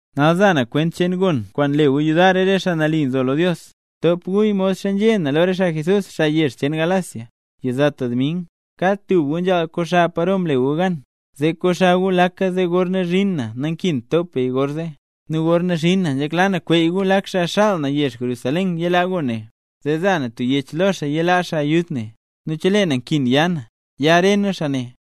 Nal za na kwent cheen gon kwaan le gu yudar re xaa mle nambey Jesús. Btop guya modxa nzhé na lo re xaa Jesús, xaa re yezh cheen Galacia. Yizata dming, kad tub gu nzhaal koxa paro mle gu gan, zee koxa gu laka zee gorna zhin na nankint top beya gor zee. Nu gorna zhin na nzhekla na kweey gu lak xaa xaal na yezh Jerusalén yilaa gon ne, zee za na tub yech lo xaa yilaa ayud ne. Nu chelee na nkin ya na, ya re nu xaa ne.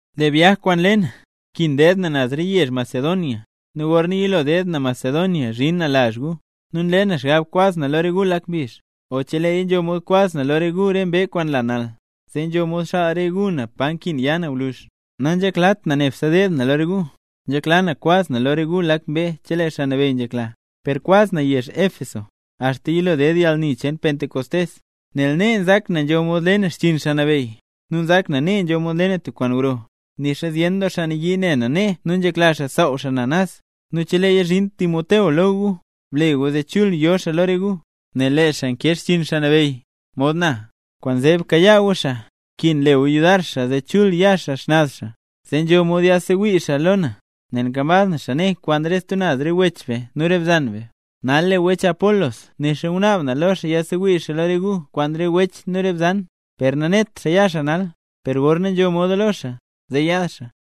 Lee byaj kwaan le na, nkin deed na naz re yezh Macedonia, nu gorna yilo deed na Macedonia zhin na lazh gu. Nu nle na xgab kwaz na lo re gu lak mbizh, o cheleeya nzho moda kwaz na lo re gu re mbee kwaan nla nal, zee nzho mod xaal re gu na pa nkin ya na gwluzh. Nanzheklat na nebse deed na lo re gu, nzhekla na kwaz na lo re gu lak mbee chelee Xaa Nabeyy nzhekla, per kwaz na yezh Éfeso, axta yilo ded yalni cheen Pentecostés, nel nee nzak na nzho mod le na xchiin Xaa Nabeyy, nu nzak na nee nzho mod le na tub kwaan gro, nixa zyen doo xaa nayii ne na nee nu nzhekla xaa saaw xaa na naz. Nu cheleeya zhin Timoteo lo gu, ble gu zee chul yo xaa lo re gu, nel lee xaa nkee xchiin Xaa Nabeyy, mod na. Kwaanzee bkayaa gu xaa; nkin le gu yudar xaa zee chul ya xaa xnaz xaa, zee nzho mod yaadsewii xaa lo na, nel nkambaz na xaa nee kwaan re stub naz re wech be nu re bzan be. Nal lee wech Apolos nixa ngunaab na lo xaa yaadsewii xaa lo re gu kwaan re wech nu re bzan, per nanet xaa ya xaa nal, per gorna nzho moda lo xaa, zee yaad xaa.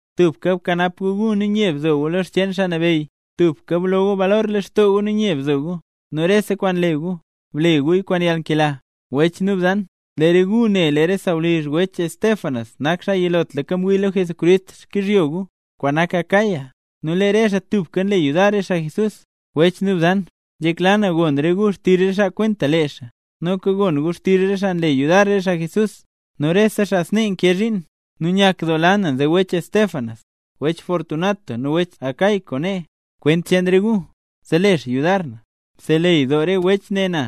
Tubka bkanap gu gu, nu nye bzo gu lo xcheen Xaa Nabeyy. Tubka blo gu balor lextoo gu nu nye bzo gu. Nu rese kwaan le gu, ble guya kwaan yalnkela. Wech nu bzan, lee re gu ne lee re sawlizh wech Estéfanas nak xaa yilotlaka mwii lo Jesucrist xkyizhyo gu, kwaan nak Acaya, nu lee re xaa tubka nle yudar re xaa Jesús, xaa nambey. Wech nu bzan, nzhekla na gon re gu xtizh re xaa kwenta lee xaa, noka gon gu xtizh rese xaa nle yudar re xaa Jesús, nu noka rese xaa snee nkee zhiin. Nu nyakdoola na nze wech Estéfanas, wech Fortunato nu wech Acaico nee, kwent cheen re gu, zee le xaa yudar na. Mseleyy doo re wech ne na,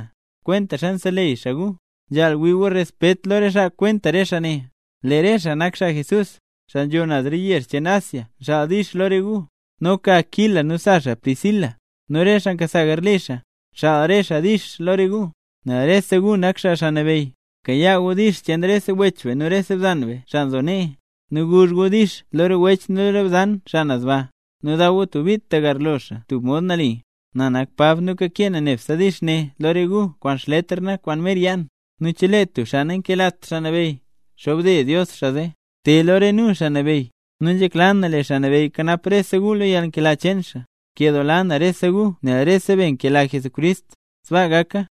kwentaxa nseleyy xaa gu. Nzhaal wii gu respet lo re xaa kwenta re xaa ne. Lee re xaa nak xaa Jesús, xaa nzho naz re yezh cheen Asia nxaal “dix” lo re gu. Noka Aquila nu sa xaa Priscila, nu re xaa nkasa garli xaa, nxaal re xaa “dix” lo re gu, nel rese gu nak xaa Xaa Nabeyy. Bkayaa gu “dix” cheen rese wech nu rese bzan, xaa nzo nee, nu guzh gu “dix” lo re wech nu re bzan xaa naz baa, nu daw gu tub bit tagarlo xaa tub mod nali. Na nak Pab nu kakee na nebse “dix” ne lo re gu kwaan xletr na, kwaan mer yaa na. Nu chelee tub xaa nankelat Xaa Nabeyy, xobde Dios xaa zee. ¡Te lo re nu, Xaa Nabeyy! Nu nzhekla na lee Xaa Nabeyy kanap rese gu lo yalnkela cheen xaa. Nkeladoo na rese gu nel rese be nkela Jesucrist. Sbaa gaka.